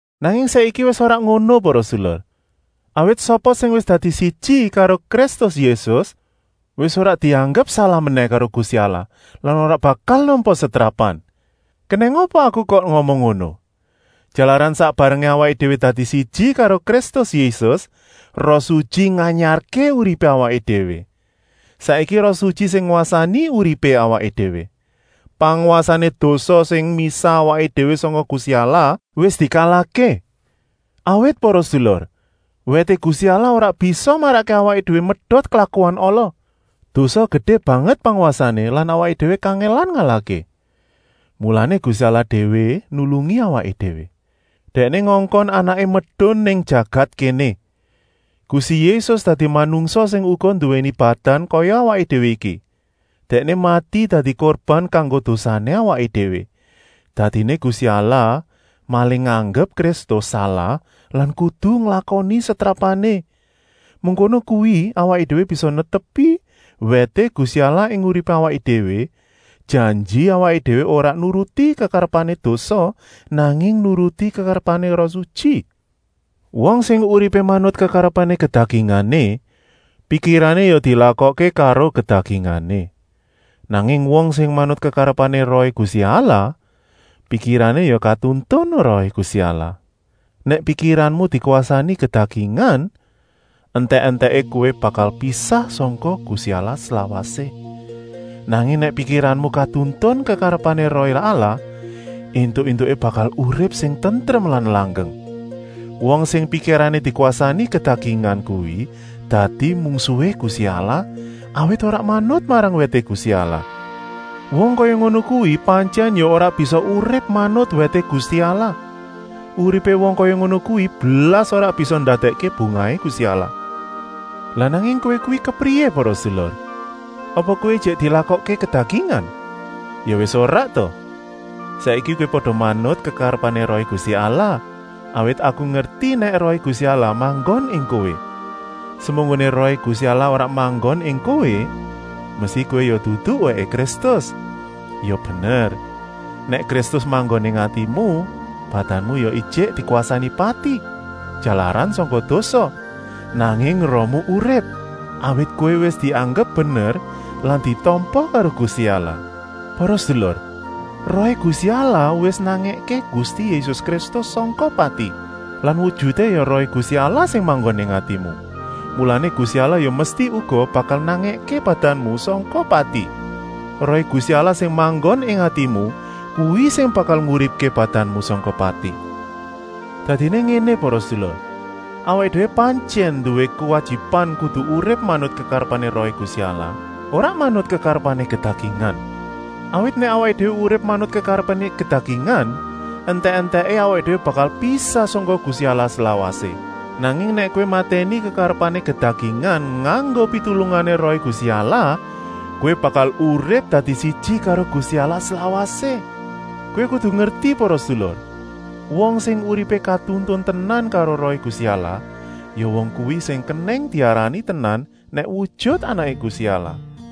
Nanging saiki wis ora ngono para sedulur, awit sapa sing wis dadi siji karo Kristus Yésus wis ora dianggep salah menèh karo Gusti Allah lan ora bakal nampa setrapan. Kenèng apa aku kok ngomong ngono? Jalaran sak barengé awaké déwé dadi siji karo Kristus Yésus, Roh Sutyi nganyarké uripé awaké déwé. Saiki Roh Sutyi sing ngwasani uripé awaké déwé. Pangwasané dosa, sing misah awaké déwé sangka Gusti Allah, wis dikalahké. Awit para sedulur, wèté Gusti Allah ora bisa marakké awaké déwé medot klakuan ala. Dosa gedé banget pangwasané lan awaké déwé kangèlan ngalahké. Mulané Gusti Allah déwé nulungi awaké déwé. Dèkné ngongkon Anaké medun nang jagat kéné. Gusti Yésus dadi manungsa sing uga nduwèni badan kaya awaké déwé iki. Dèkné mati dadi kurban kanggo dosané awaké déwé. Dadiné Gusti Allah malih nganggep Kristus salah lan kudu nglakoni setrapané. Mengkono kuwi awaké déwé bisa netepi wèté Gusti Allah ing uripé awaké déwé, janji awaké déwé ora nuruti kekarepané dosa, nanging nuruti kekarepané Roh Sutyi. Wong sing uripé manut kekarepané kedagingané, pikirané ya dilakokké karo kedagingané. Nanging wong sing manut kekarepané Rohé Gusti Allah, pikirané ya katuntun Rohé Gusti Allah. Nèk pikiranmu dikwasani kedagingan, entèk-entèké kowé bakal pisah sangka Gusti Allah slawasé. Nanging nèk pikiranmu katuntun kekarepané Rohé Allah, éntuk-éntuké bakal urip sing tentrem lan langgeng. Wong sing pikirané dikwasani kedagingan kuwi dadi mungsuhé Gusti Allah, awit ora manut marang wèté Gusti Allah. Wong kaya ngono kuwi pantyèn ya ora bisa urip manut wèté Gusti Allah. Uripé wong kaya ngono kuwi blas ora bisa ndadèkké bungahé Gusti Allah. Lah nanging kowé kuwi kepriyé para sedulur? Apa kowé ijik dilakokké kedagingan. Ya wis ora ta! Saiki kowé pada manut kekarepané Rohé Gusti Allah, awit aku ngerti nèk Rohé Gusti Allah manggon ing kowé. Semunggoné Rohé Gusti Allah ora manggon ing kowé, mesti kowé ya dudu wèké Kristus. Ya bener, nèk Kristus manggon ing atimu, badanmu ya ijik dikwasani pati, jalaran sangka dosa, nanging rohmu urip, awit kowé wis dianggep bener lan ditampa karo Gusti Allah. Para sedulur, Rohé Gusti Allah wis nangèké Gusti Yésus Kristus sangka pati. Lan wujuté ya Rohé Gusti Allah sing manggon ing atimu, mulané Gusti Allah ya mesti uga bakal nangèké badanmu sangka pati. Rohé Gusti Allah sing manggon ing atimu, kuwi sing bakal nguripké badanmu sangka pati. Dadiné ngéné para sedulur: awaké déwé pantyèn nduwé kuwajiban kudu urip manut kekarepané Rohé Gusti Allah, ora manut kekarepané kedagingan. Awit nèk awaké déwé urip manut kekarepané kedagingan, entèk-entèké awaké déwé bakal pisah sangka Gusti Allah slawasé. Nanging nèk kowé matèni kekarepané kedagingan nganggo pitulungané Rohé Gusti Allah, kowé bakal urip dadi siji karo Gusti Allah slawasé. Kowé kudu ngerti para sedulur, wong sing uripé katuntun tenan karo Rohé Gusti Allah, ya wong kuwi sing kenèng diarani tenan nèk wujut anaké Gusti Allah.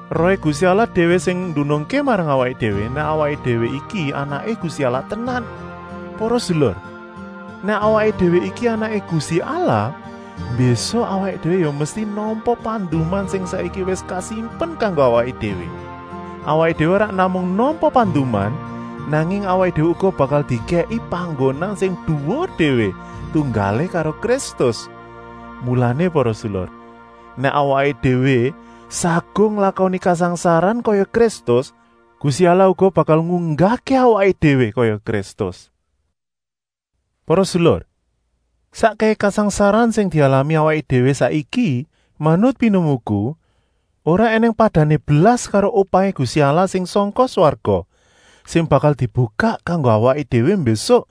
Rohé Gusti Allah déwé sing ndunungké marang awaké déwé, nèk awaké déwé iki anaké Gusti Allah tenan. Para sedulur, nèk awaké déwé iki anaké Gusti Allah, mbésuk awaké déwé ya mesti nampa panduman sing saiki wis kasimpen kanggo awaké déwé. Awaké déwé ora namung nampa panduman, nanging awaké déwé uga bakal dikèki panggonan sing duwur déwé, tunggalé karo Kristus. Mulané para sedulur, nèk awaké déwé saguh nglakoni kasangsaran kaya Kristus, Gusti Allah uga bakal ngunggahké awaké déwé kaya Kristus. Para sedulur, sakkèhé kasangsaran sing dialami awaké déwé saiki, manut pinemuku, ora ènèng padané blas karo upahé Gusti Allah sing sangka swarga, sing bakal dibukak kanggo awaké déwé mbésuk.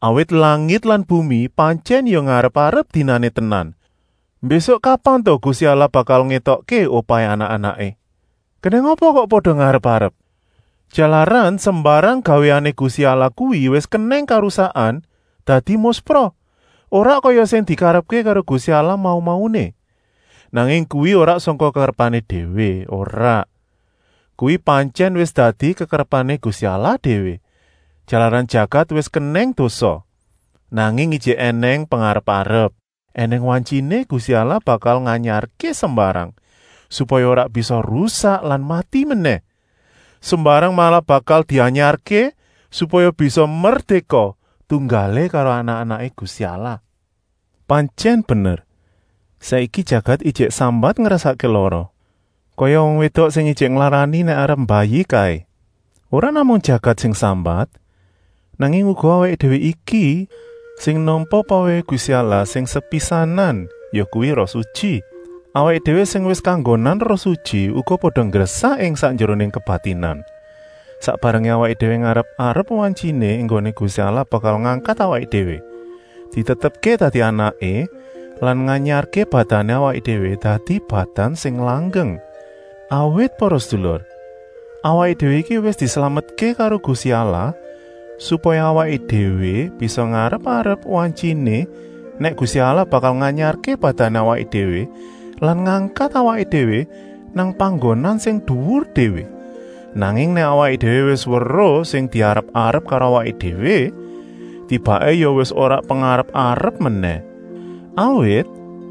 Awit langit lan bumi pantyèn ya ngarep-arep dinané tenan, mbésuk kapan ta Gusti Allah bakal ngétokké upahé anak-anaké. Kenèng apa kok pada ngarep-arep? Jalaran sembarang gawéané Gusti Allah kuwi wis kenèng karusakan, dadi muspra, ora kaya sing dikarepké karo Gusti Allah mau-mauné. Nanging kuwi ora sangka kekarepané déwé, ora, kuwi pantyèn wis dadi kekarepané Gusti Allah déwé, jalaran jagat wis kenèng dosa. Nanging ijik ènèng pengarep-arep. Enèng wantyiné Gusti Allah bakal nganyarké sembarang, supaya ora bisa rusak lan mati menèh. Sembarang malah bakal dianyarké, supaya bisa merdéka, tunggalé karo anak-anaké Gusti Allah. Pantyèn bener, saiki jagat ijik sambat ngrasakké lara, kaya wong wédok sing ijik nglarani nèk arep mbayi kaé. Ora namung jagat sing sambat, nanging uga awaké déwé iki sing nampa pawèhé Gusti Allah sing sepisanan, yakuwi Roh Sutyi. Awaké déwé sing wis kanggonan Roh Sutyi uga pada nggresah ing sakjeroné kebatinan, sak barengé awaké déwé ngarep-arep wantyiné enggoné Gusti Allah bakal ngangkat awaké déwé, ditetepké dadi anaké lan nganyarké badané awaké déwé dadi badan sing langgeng. Awit para sedulur, awaké déwé iki wis dislametké karo Gusti Allah, supaya awaké déwé bisa ngarep-arep wantyiné nèk Gusti Allah bakal nganyarké badané awaké déwé lan ngangkat awaké déwé nang panggonan sing duwur déwé. Nanging nèk awaké déwé wis weruh sing diarep-arep karo awaké déwé, tibaké ya wis ora pengarep-arep menèh. Awit,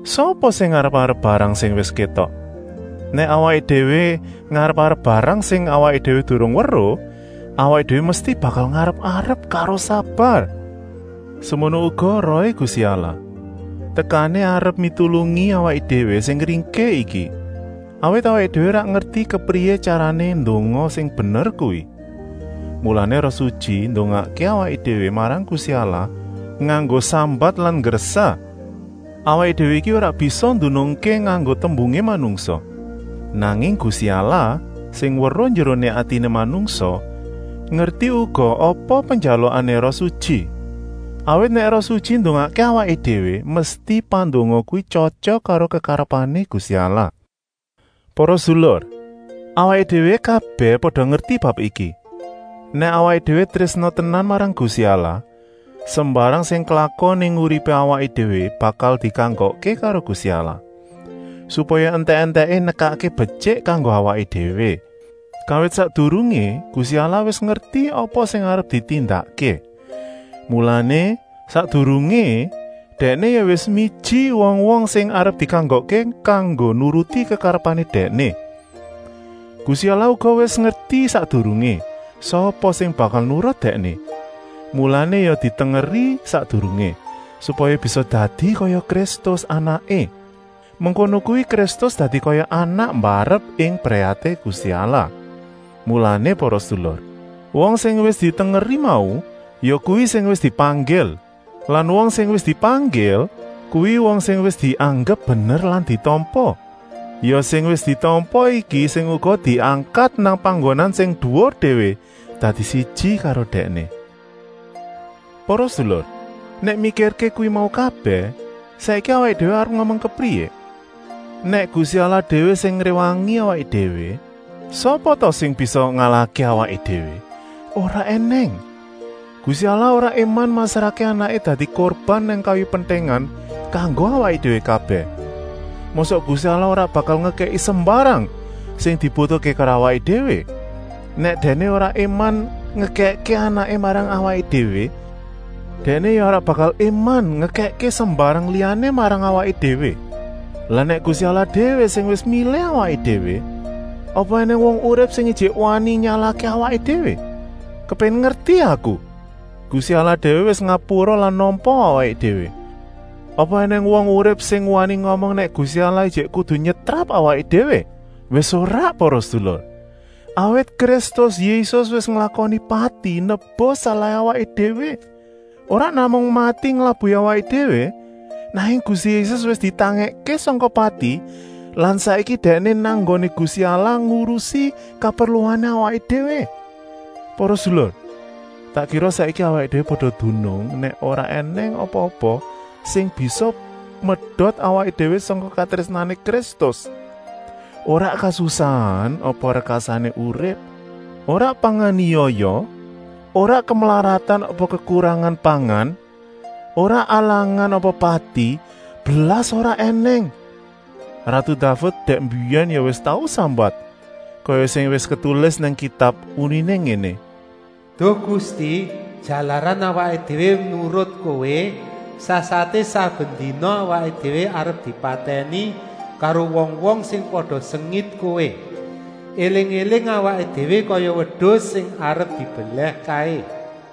sapa sing ngarep-arep barang sing wis kétok? Nèk awaké déwé ngarep-arep barang sing awaké déwé durung weruh, awaké déwé mesti bakal ngarep-arep karo sabar. Semono uga Rohé Gusti Allah, tekané arep mitulungi awaké déwé sing ringkih iki. Awit awaké déwé ora ngerti kepriyé tyarané ndonga sing bener kuwi. Mulané Roh Sutyi ndongakké awaké déwé marang Gusti Allah, nganggo sambat lan nggresah; awaké déwé iki ora bisa ndunungké nganggo tembungé manungsa. Nanging Gusti Allah, sing weruh njeroné atiné manungsa, ngerti uga apa penjalukané Roh Sutyi. Awit nèk Roh Sutyi ndongakké awaké déwé, mesti pandonga kuwi tyotyok karo kekarepané Gusti Allah. Para sedulur, awaké déwé kabèh pada ngerti bab iki: nèk awaké déwé trésna tenan marang Gusti Allah, sembarang sing klakon ing uripé awaké déwé bakal dikanggokké karo Gusti Allah, supaya entèk-entèké nekakké betyik kanggo awaké déwé. Kawit sakdurungé Gusti Allah wis ngerti apa sing arep ditindakké, mulané, sakdurungé Dèkné ya wis miji wong-wong sing arep dikanggokké kanggo nuruti kekarepané Dèkné. Gusti Allah uga wis ngerti sakdurungé, sapa sing bakal nurut Dèkné, mulané ya ditengeri sakdurungé, supaya bisa dadi kaya Kristus, Anaké. Mengkono kuwi Kristus dadi kaya anak mbarep ing brayaté Gusti Allah. Mulané para sedulur, wong sing wis ditengeri mau, yakuwi sing wis dipanggil. Lan wong sing wis dipanggil kuwi wong sing wis dianggep bener lan ditampa. Ya sing wis ditampa iki sing uga diangkat nang panggonan sing duwur déwé, dadi siji karo Dèkné. Para sedulur, nèk mikirké kuwi mau kabèh, saiki awaké déwé arep ngomong kepriyé? Nèk Gusti Allah déwé sing ngréwangi awaké déwé, sapa ta sing bisa ngalahké awaké déwé? Ora ènèng! Gusti Allah ora éman masrahké Anaké dadi kurban nang kayu pentèngan kanggo awaké déwé kabèh. Mosok Gusti Allah ora bakal ngekèki sembarang sing dibutuhké karo awaké déwé? Nèk Dèkné ora éman ngekèkké Anaké marang awaké déwé, Dèkné ya ora bakal éman ngekèkké sembarang liyané marang awaké déwé. Lah nèk Gusti Allah déwé sing wis milih awaké déwé, apa ènèng wong urip sing ijik wani nyalahké awaké déwé? Kepéngin ngerti aku! Gusti Allah déwé wis ngapura lan nampa awaké déwé, apa ènèng wong urip sing wani ngomong nèk Gusti Allah ijik kudu nyetrap awaké déwé? Wis ora para sedulur, awit Kristus Yésus wis nglakoni pati nebus salahé awaké déwé. Ora namung mati nglabuhi awaké déwé, nanging Gusti Yésus wis ditangèkké sangka pati lan saiki Dèkné nang nggoné Gusti Allah ngurusi kaperluané awaké déwé. Para sedulur, tak kira saiki awaké déwé pada dunung nèk ora ènèng apa-apa sing bisa medot awaké déwé sangka katrésnané Kristus. Ora kasusahan apa rekasané urip, ora panganiaya, ora kemlaratan apa kekurangan pangan, ora alangan apa pati, blas ora ènèng! Ratu Daved dèk mbiyèn ya wis tau sambat, kaya sing wis ketulis nang Kitab, uniné ngéné: “Duh Gusti, jalaran awaké déwé nurut Kowé, sasaté saben dina awaké déwé arep dipatèni karo wong-wong sing pada sengit Kowé. Eling-éling awaké déwé kaya wedus sing arep dibelèh kaé.”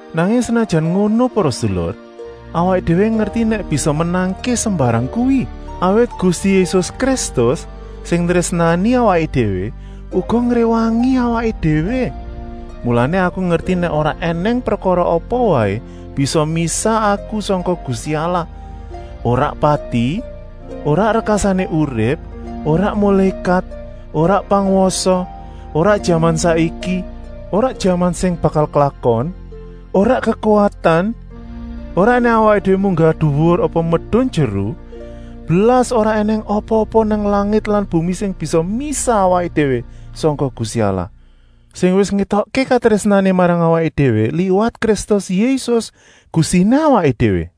Nanging senajan ngono para sedulur, awaké déwé ngerti nèk bisa menangké sembarang kuwi, awit Gusti Yésus Kristus, sing nrésnani awaké déwé, uga ngréwangi awaké déwé. Mulané aku ngerti nèk ora ènèng prekara apa waé bisa misah aku sangka Gusti Allah, ora pati, ora rekasané urip, ora mulékat, ora pangwasa, ora jaman saiki, ora jaman sing bakal klakon, ora kekuwatan, ora nèk awaké déwé munggah duwur apa medun jeru, blas ora ènèng apa-apa nang langit lan bumi sing bisa misah awaké déwé sangka Gusti Allah, sing wis ngétokké katrésnané marang awaké déwé liwat Kristus Yésus, Gustiné awaké déwé.